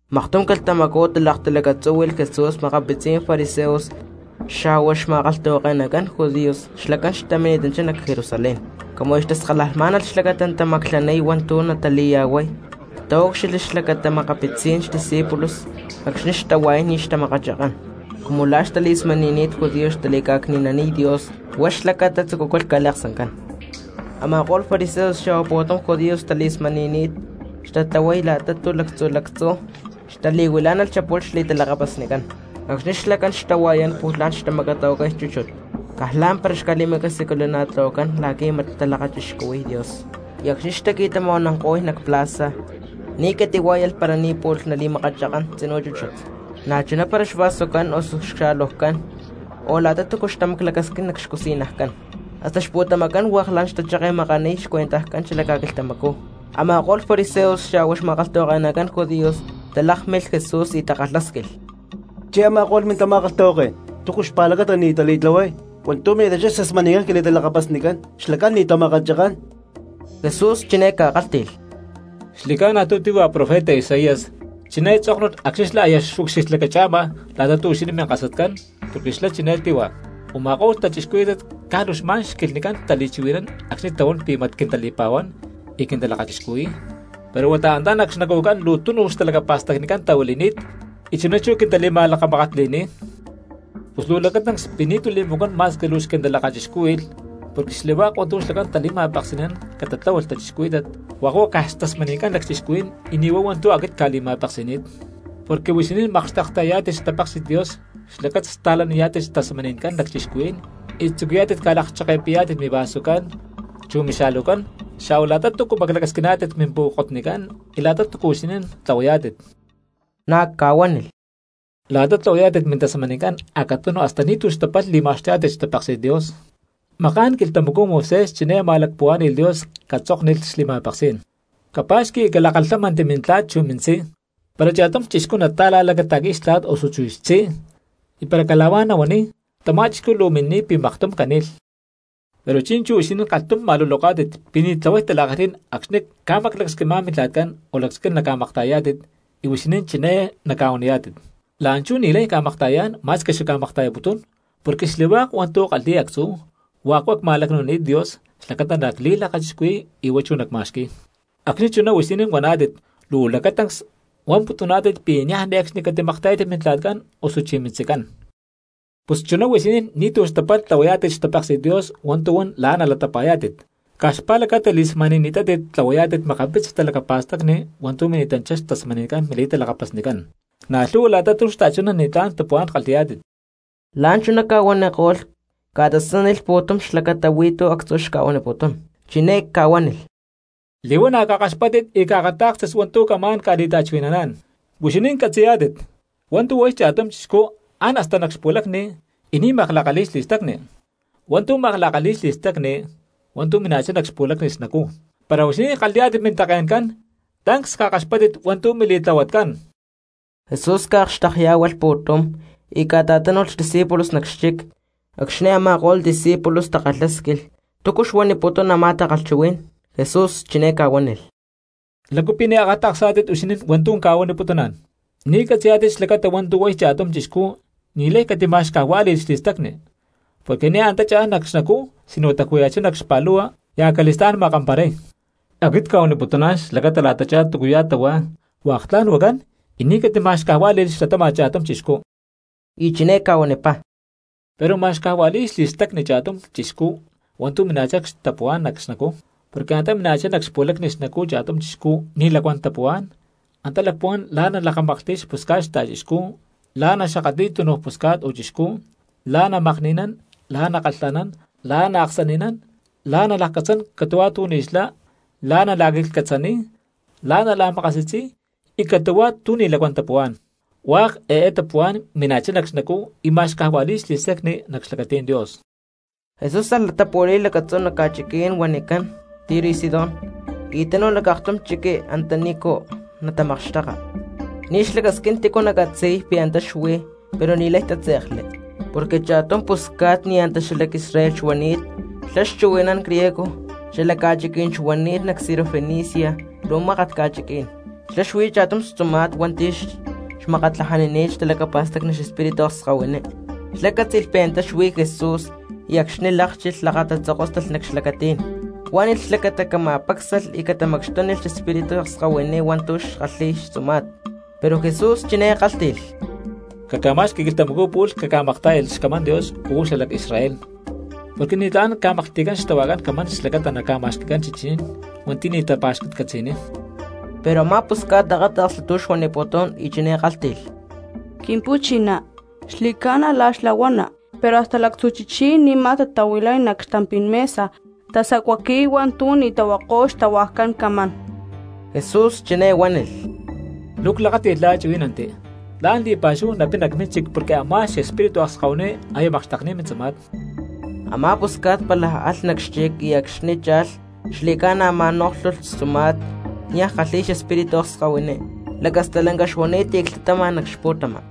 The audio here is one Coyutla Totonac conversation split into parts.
Maktum quilhtamacú talaktalacatzúhui̠lh Jesús makapitzi fariseos xa̠hua xma̠kalhtahuake̠nacán judíos xlacán xtamini̠tanchá nac Jerusalén. Cumu aya xtaskalajmá̠nalh xlacata natamaclaniy hua̠ntu̠ natali̠ya̠huay taúcxilhli xlacata makapitzí̠n xdiscípulos acxni̠ xtahua̠yán ni̠ xtamakachakán cumu la̠ xtali̠smani̠ni̠t judíos xtali̠ca̠cni̠naniy Dios, huá xlacata tzucúcalh ca̠liaksancán. Ama̠ko̠lh fariseos xa̠hua pu̠tum judíos xtali̠smani̠ni̠t tatlahuay la̠ta tu̠ lactzu̠ lactzú xtali̠huilá̠nalh xapu̠lh xli̠talakapasnicán. Acxni̠ xlacán xtahua̠yán pu̠lh la̠n natamacatahuacay chúchut caj lá̠mpara ca̠li̠macasiculana̠tlahuacán la̠qui̠ mat xtalakachixcuhui̠y Dios. Y acxni̠ xtaqui̠tama̠huananko̠y nac plaza ni̠ catitahuá̠yalh para ni̠ pu̠lh nali̠makachakán tzinú chúchut. Na̠chuná para xvasocán osu cxa̠lujcán, o la̠ta túcu xtamaclacasquín nac xcusi̠najcán, hasta xpu̠tamacán hua̠k la̠n xtacheke̠makaniy xcuenta xala ca̠quilhtamacú. Ama̠ko̠lh fariseos xa̠hua xma̠kalhtahuake̠nacán judíos talákmilh Jesús y takalhásquilh: —Chí a̠ma̠ko̠lh mintama̠kalhtahuaké̠n, ¿túcu xpa̠lacata ni̠ tali̠tlahuay hua̠ntu̠ mini̠tanchá xtasmani̠ncán quili̠talakapasnicán? Xlacán ni̠ tamakachakán. Jesús chiné ca̠kálhti̠lh: —Xli̠ca̠na tu̠ tíhua profeta Isaías, chiné tzóknulh acxni̠ xlá aya xucxilhlacacha̠ma la̠ta tu̠ huixinín minkasatcán, porque xlá chiné tíhua: Uma̠ko̠lh cristianos caj luu xma̠n xquilhnicán tali̠chuhui̠nán acxni̠ tahuán pi̠ mat quintali̠pa̠huán y quintalakachixcuhui̠y, pero huata antá nac xnacujcán luu túnuj talacapa̠stacni tahuili̠ni̠t, y chuná chú quintali̠ma̠lakamakatli̠niy. Pus luu lacatancs pi̠ ni̠tu̠ li̠macuán ma̠squi xquintalakachixcúhui̠lh, porque xli̠hua̠k hua̠ntu̠ xlacán tali̠ma̠peksi̠nán catatláhualh cristianos hua̠k huá caj xtasmani̠ncán lacchixcuhuí̠n y ni̠ huá hua̠ntu̠ aquit cca̠li̠ma̠peksi̠ni̠t. Porque huixinín makxtekta̠yayá̠tit xtapéksi̠t Dios xlacata sta̠laniyá̠tit xtasmani̠ncán lacchixcuhuí̠n y tzucuyá̠tit ca̠lakcheke̠pi̠yá̠tit mivasucán, chu mixa̠lujcán xa̠hua la̠ta túcu maclacasquiná̠tit mimpu̠kotnicán, y la̠ta túcua huixinín tlahuayá̠tit. Na̠ ca̠huánilh: —La̠ta tlahuayá̠tit mintasmani̠ncán acatunu hasta ni̠tu̠ xtapalh li̠ma̠xtuyá̠tit xtapéksi̠t Dios. Maka̠n quilhtamacú Moisés chiné ma̠lacpuhuá̠ni̠lh Dios catzóknilh xli̠ma̠peksí̠n: “Capa̠xqui y calakalhámanti mintla̠t chu mintzí. Para cha̠tum cristiano nata̠la̠lacata̠qui̠y xtla̠t osuchí xtzí y para cala̠huá nahuaniy, tamá cristiano luu mini̠niy pi̠ maktum cani̠lh.” Pero chi̠nchú huixinín kalhtum ma̠luloká̠tit pi̠ ni̠ tlahuay tala̠kalhí̠n acxni̠ ca̠maclacasquimá̠n mintla̠tcán o lacasquín naca̠makta̠yayá̠tit y huixinín chiné naca̠huaniyá̠tit: “La̠nchú ni̠lay cca̠makta̠yayá̠n ma̠squi xacca̠makta̠yaputún porque xli̠hua̠k hua̠ntu̠ ckalhi̠y actzú, hua̠k hua̠ cma̠lacnu̠nini̠t Dios xlacata nacli̠lakachixcuhui̠y y huá chú nacma̠xqui̠y.” Acxni̠ chuná huixinín huaná̠tit luu lacatancs huamputuná̠tit pi̠ niaj ne̠cxni catimakta̠yátit mintla̠tcán osuchí mintzicán. Pus chuná huixinín ni̠tu̠ xtapalh tlahuayá̠tit xtapéksi̠t Dios hua̠ntu̠ huán la̠ nalatapa̠yá̠tit caj xpa̠lacata li̠smani̠ni̠tátit tlahuayá̠tit makapitzi talacapa̠stacni hua̠ntu̠ mini̠tanchá xtasmaní̠n mili̠talakapasnicán. Na̠ lhu̠hua la̠ta tu̠ xta̠chuná ni̠tlá̠n tapuhuá̠n kalhi̠yá̠tit. La̠nchuná ca̠huaniko̠lh ca̠tasánilh pu̠tum cristianos xlacata actzú tu̠ xca̠huaniputún, chiné ca̠huánilh: —Li̠huana̠ cakaxpátit y caakatá̠kstit hua̠ntu̠ camá̠n ca̠li̠ta̠chuhui̠naná̠n. Huixinín catzi̠yá̠tit hua̠ntu̠ huay cha̠tum chixcú án hasta nac xpu̠lacni y ni̠ makla̠kalhi̠y xli̠stacni, hua̠ntu̠ makla̠kalhi̠y xli̠stacni hua̠ntu̠ mina̠chá nac xpu̠lacni xnacú. Para huixinín kalhi̠yá̠tit mintake̠ncán, tancs cakaxpáttit hua̠ntu̠ mili̠tlahuatcán. Jesús ca̠akxtekyá̠hualh pu̠tum cristiano y ca̠ta̠tánu̠lh xdiscípulos nac xchic; acxni̠ a̠ma̠ko̠lh discípulos takalhásquilh túcu xuaniputún a̠má takalhchuhuí̠n. Jesús chiné ca̠huánilh: —¿Lácu pi̠ ni̠ akata̠ksá̠tit huixinín hua̠ntu̠ cca̠huaniputuná̠n? Ni̠ catzi̠yá̠tit xlacata hua̠ntu̠ huay cha̠tum chixcú ni̠lay catima̠xcajuá̠li̠lh xli̠stacni, porque ni̠ antá cha̠n nac xnacú sino taju̠ya̠chá nac xpa̠lu̠hua y acali̠stá̠n makamparay. Xlá xuamputún xlacata la̠tachá túcuya̠ tahuá hua̠k tla̠n huacán y ni̠ catima̠xcajuá̠li̠lh xlatama̠t cha̠tum cristiano. Y chiné ca̠huanipá: —Pero ma̠xcajua̠li̠y xli̠stacni cha̠tum cristiano hua̠ntu̠ mina̠chá xtapuhuá̠n nac xnacú. Porque antá mina̠chá nac xpu̠lacni xnacú cha̠tum cristiano ni̠ lacuán tapuhuá̠n, antá lacpuhuán la̠ nalakamaklhti̠y xpusca̠t xta̠chixcú, la̠ naxakatli̠y túnuj pusca̠t o chixcú, la̠ namakni̠nán, la̠ nakalha̠nán, la̠ naaksani̠nán, la̠ nalakcatzán catu̠huá tu̠ ni̠ xlá, la̠ nala̠quiclhcatzaniy, la̠ nala̠makasi̠tzi̠y, y catu̠huá tu̠ ni̠ lacuán tapuhuá̠n. Hua̠k eé tapuhuá̠n mina̠chá nac xnacú y ma̠xcajua̠li̠y xli̠stacni nac xlacatí̠n Dios. Jesús alh latapu̠li̠y lacatzú nac ca̠chiquí̠n huanicán Tiro y Sidón, y tánu̠lh nac aktum chiqui antanícu natamakxteka. Ni̠ xlacasquín tícu nacatzi̠y pi̠ antá xuí pero ni̠lay tátze̠kli porque cha̠tum pusca̠t ni̠ antá xalac Israel xuani̠t xlá xchuhui̠nán griego xalacachín xuani̠t nac Sirofenicia luu mákat ca̠chiquí̠n. Xlá xuí cha̠tum xtzuma̠t hua̠nti̠ xmakatlajanini̠t xtalacapa̠stacni xespíritu akskahuiní. Xlá cátzi̠lh pi̠ antá xuí Jesús, acxni̠ lákchilh lakatatzokóstalh nac xlacatí̠n, huánilh xlacata cama̠pácsalh y catamacxtúnilh xespíritu akskahuiní hua̠ntu̠ xkalhi̠y xtzuma̠t. Pero Jesús chiné kálhti̠lh: —Caca̠ma̠xqui quilhtamacú pu̠lh cacca̠maktá̠yalh xcamán Dios uú xalac Israel, porque ni̠tlá̠n ca̠maklhti̠cán xtahuajcán camán xlacata naca̠ma̠xqui̠cán chichí̠n hua̠nti̠ ni̠ natapa̠xcatcatzi̠niy. Pero a̠má pusca̠t akáta̠ksli tu̠ xuaniputún y chiné kálhti̠lh: —Quimpu̠chiná, xli̠ca̠na xlá la̠ huana, pero hasta lactzu̠ chichí̠n ni̠ma tatahuilay nac xtampí̠n mesa tasacuaqui̠y hua̠ntu̠ ni̠ tahuako̠y xtahuajcán camán. Jesús chiné huánilh: —Luu clakáti̠lh la̠ chuhuí̠nanti, tla̠n li̠pa̠xúhu napina cmínchic porque a̠má xespíritu akskahuiní aya makxtekni̠t mintzuma̠t. Amá pusca̠t pálaj alh nac xchic y acxni̠ cha̠lh xli̠ca̠na ma̠nóklhulh xtzuma̠t niaj xkalhi̠y xespíritu akskahuiní, lacastalanca xuani̠t y clhtatama nac xpu̠tama.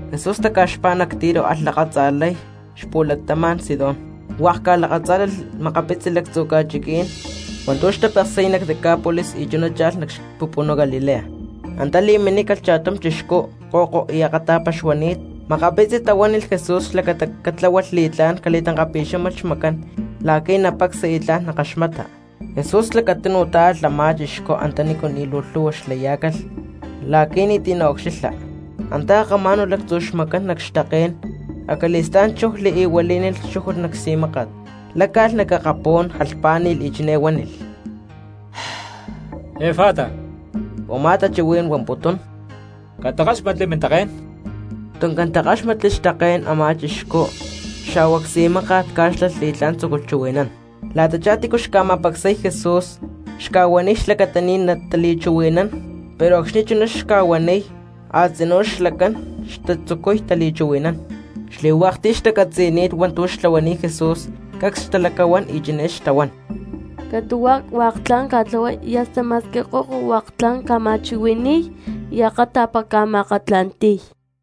Jesús taca̠xpá nac Tiro alh lakatza̠lay cxapu̠latama̠n Sidón, hua̠k ca̠lakatzá̠lalh makapitzi lactzu̠ ca̠chiquí̠n hua̠ntu̠ xtapeksi̠y nac Decápolis y chuná cha̠lh nac xapupunú Galilea. Antá li̠minícalh cha̠tum chixcú ko̠ko y akata̠pa xuani̠t. Makapitzi cristianos tahuánilh Jesús xlacata catláhualh li̠tlá̠n cali̠tankapi̠xámalh xmacán la̠qui̠ napacsa y tla̠n nakaxmata. Jesús lacatunu tá̠alh a̠má chixcú antanícu ni̠ luu lhu̠hua xtalayá̠nalh cristianos la̠qui̠ ni̠ti̠ naca̠ucxilha. Antá akamá̠nu̠lh lactzu xmacán nac xtaké̠n, acali̠stá̠n chujli y huilí̠nilh xchújut nac csi̠máka̠t. Láca̠lh nac akapú̠n, jalhpá̠ni̠lh y chiné huánilh: —¡Efata! —u̠má tachuhuí̠n huamputún: ¡Catakáxmatli mintaké̠n! Tuncán takáxmatli xtaké̠n a̠má chixcú xa̠hua csi̠máka̠t cá̠xlalh y tla̠n tzúculh chuhui̠nán. La̠tachá tícu xma̠pacsay Jesús xca̠huaniy xlacata ni̠ natali̠chuhui̠nán, pero acxni̠ chuná xca̠huaniy, a̠tzinú xlacán xtzucuy tali̠chuhui̠nán. Xli̠hua̠k ti̠ xtacatzi̠ni̠t hua̠ntu̠ xca̠tlahuani̠t Jesús cacs xtalacahuán y chiné xtahuán: —Catu̠huá hua̠k tla̠n ca̠tlahuay y hasta ma̠squi ko̠ko hua̠k tla̠n ca̠ma̠chuhui̠ni̠y y akata̠pa ca̠ma̠akatla̠nti̠y.